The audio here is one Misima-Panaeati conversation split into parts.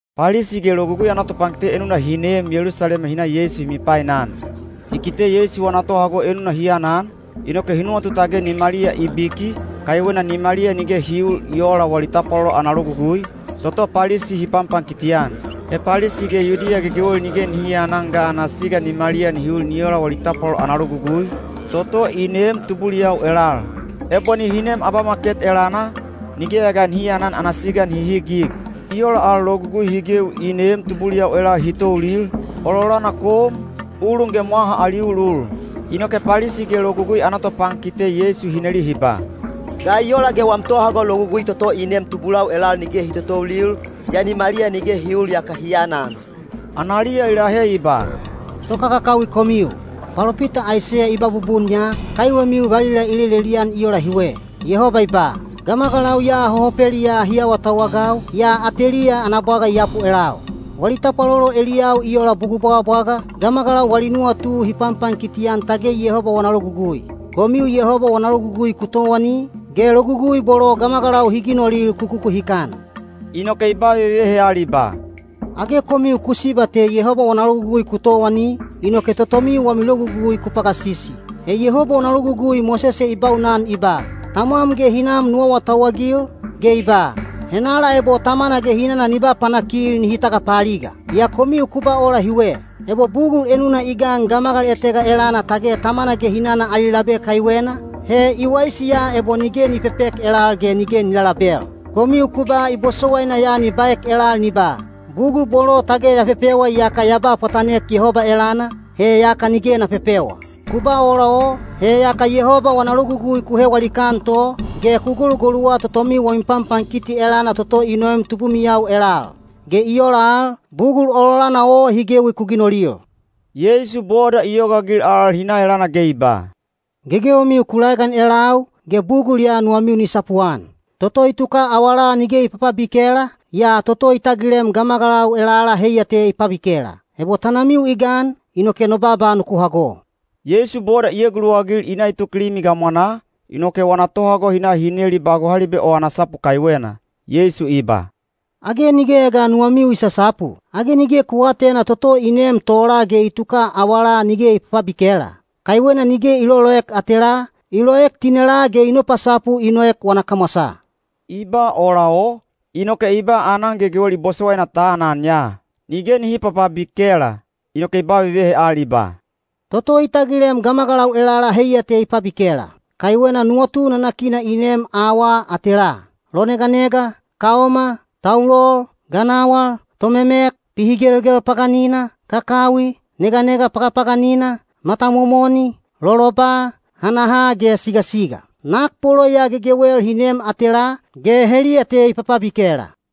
Palisi ge Logugui ana topankite enuna hi neem Yelusalema hi na Yeisu hi mipainan. Hi kite Yeisu wana tohago enuna hi anan, inoke hi nuwatu tage nimaliya i biki, kaiwena nimaliya nige hi uul i oola wali tapwalolo ana logugui, toto Palisi hi panpankiti-an. He Palisi ge Yudiya gegewel nige nihi aanan ga ana siga nimaliya nihi ul ni ola wali tapwalolo ana logugui, toto i neem tubuliyau elal. Ebo nihi neem abamaket elana, nigeya ga nihi aanan ana siga nihi highig. I ola al logugui hi gewi i neem tubuliyau elal hi toulil, ololana kom, ulun ge mwaha ali ulul. Inoke Palisi ge Logugui ana topankite Yeisu hi neli hi ba, “Ga i ola ge wam tohago logugui toto i neem tubulau elal nige hi totoulil, yaa nimaliya nige hi uul yaka hi anan?” Analiya i lahe i ba, “Tokakakawi komiu! Palopita Aiseya i ba bubun ya, kaiwemiu valila i lelelian i ola hiwe: Yehoba i ba, ‘Gamagalau ya hohopeliyaa hi awatauwagau, yaa ateliya ana bwaga i yapu elau. Wali tapwalolo eliyau i ola bugul bwagabwaga, gamagalau wali nuwatu hi panpankiti-an tage Yehoba wana logugui.’ Komiu Yehoba wana logugui ku towani, ge logugui bolo gamagalau hi ginolil ku kukuhikan.” Inoke i ba vevehe al i ba, “Age komiu ku siba te Yehoba wana logugui ku towani, inoke totomiu wami logugui ku pagasisi! He Yehoba wana logugui Mosese i baunan i ba, ‘Tamwam ge hinam nu awatauwagil,’ ge i ba, ‘Henala ebo tamana ge hinana ni ba panakil nihi tagapaaliga.’ Yaa komiu ku ba ola hiwe: Ebo bugul enuna i gan gamagal etega elana tage tamana ge hinana ali labe kaiwena, he i waisi ya ebo nige ni pepek elal ge nige ni lalabel. Komiu ku ba i bosowaina ya ni baek elal ni ba, ‘Bugul bolo tage ya pepewa iyaka ya ba pwatanek Yehoba elana, he yaka nige na pepewa.’ Ku ba ola o, he yaka Yehoba wana logugui ku hewa likaan to, ge ku golugoluwa totomiu wami panpankiti elana toto i noem tubumiyau elal. Ge i ola al, bugul ololana o hi gewi ku ginolil.” Yeisu boda i yogaagil al hi na elana ge i ba, “Gegewemiu ku laegan elau, ge bugul ya nuwamiu ni sapuan. Toto i tuka awalaa nige i papabikela, yaa toto i tagilem gamagalau elala heiya te i pabikela. Ebo tanamiu i gan, inoke no baaba nuku hago.” Yeisu boda i eguluwagil i na i tuk limi gamwanaa, inoke wana tohago hi na hi neli ba gohalibe o ana sapu kaiwena. Yeisu i ba, “Age nigeya ga nuwamiu i sasapu? Age nige ku aatena toto i neem tola ge i tuka awalaa nige i papabikela? Kaiwena nige i loloek atelaa, i loek tinelaa ge i nopasapu i noek wana kamwasaa.” (I ba ola o, inoke i ba aanan gegewel i bosowaina ta anan ya, nige nihi papabikela.) Inoke i ba vevehe al i ba, “Toto i tagilem gamagalau elala heiya te i pabikela. Kaiwena nuwatu nanakina i neem awaa atelaa: loneganega, kaoma, taulol, ganawal, tomemek, pihigelgel paganina, kakawi, neganega pagapaganina, matamomoni, loloba, hanaha ge sigasiga. Nak bolo ya gegewel hi neem atelaa, ge heliya te i papabikela!”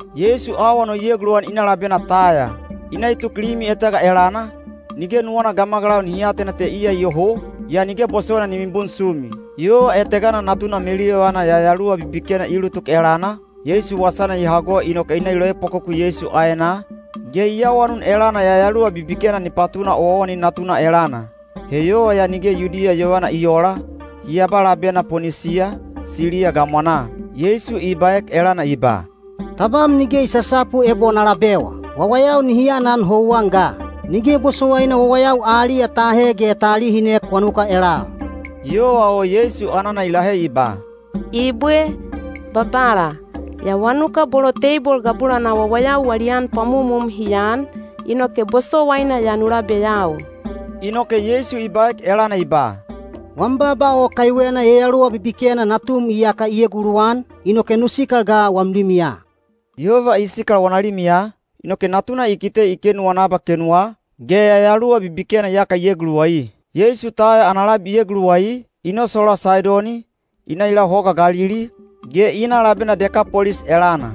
Yeisu awan o i eguluwan i na labena Taya. I na i tuk limi etega elana, nige nuwana gamagalau nihi atena te iya iyoho, yaa nige bosowaina ni mibunsumi. Yova etegana natuna meluyovana yayaluwa bibikena i ulutuk elana, Yeisu wasana i hago inoke i na i loepwakoku Yeisu aenaa, ge i awanun elana yayaluwa bibikena ni patuna owaowani natuna elana. He yova ya nige Yudiya yovana i oola, hi aba labena Ponisiya, Siliya gamwanaa. Yeisu i baek elana i ba, “Tabam nige i sasapu ebo na labewa. Wawayau nihi anan houwan ga. Nige bosowaina wawayau aliya ta ahe ge ta alihinek wanuka elal.” Yova o Yeisu anana i lahe i ba, “Ibwe, Babala. Yaa wanuka bolo teibol gabulanaa wawayau wali an pwamumum hi aan, inoke bosowaina ya nu labeyau.” Inoke Yeisu i baek elana i ba, “Wam baaba o kaiwena yayaluwa bibikena natum iyaka i eguluwan, inoke nu sikal ga wam limiya.” Yova i sikal wana limiya, inoke natuna i kite i kenuwa wana abakenuwa, ge yayaluwa bibikena iyaka i eguluwai. Yeisu Taya ana labi i eguluwai, i nosolaa Saidoni, i na i lau Hoga Galili, ge i na labena Dekapolis elana.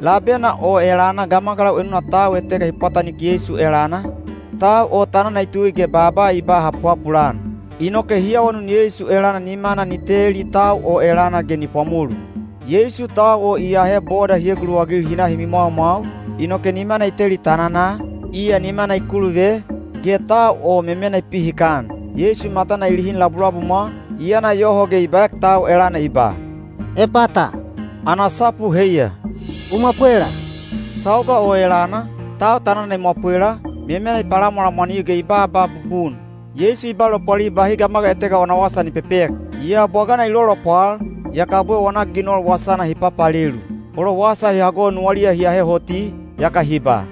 Labena o elana gamagalau enuna tau etega hi pwatanik Yeisu elana, tau o tanana i tui ge baaba i ba hapuhapul-an. Inoke hi awanun Yeisu elana nimana ni teli tau o elana ge ni pwamolu. Yeisu tau o i ahe boda hi eguluwagil hi na hi mimwaumwau, inoke nimana i teli tananaa, iya nimana i kuluve, ge tau o memena i pihikan. Yeisu matana i lihin labulabumwa, i yana yoho ge i baek tau elana i ba, “Epata,” ana sapu heiya, “U mwapwela!” Sauga o elana, tau tanana i mwapwela, memena i palamwalamwaniu ge i baaba bubun. Yeisu i ba lopwalil bahi gamagal etega wana wasa nihi pepek. Yaa bwagana i lolopwal, yaka abwe wana ginol wasana hi papalelu. Bolo wasa hi hago nuwaliya hi ahe hoti, yaka hi ba,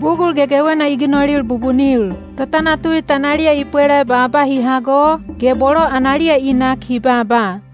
“Bugul gegewena i ginol bubunil! Totanatui tanaliya i pwela baaba hi hago, ge bolo analiya i nak hi baaba.”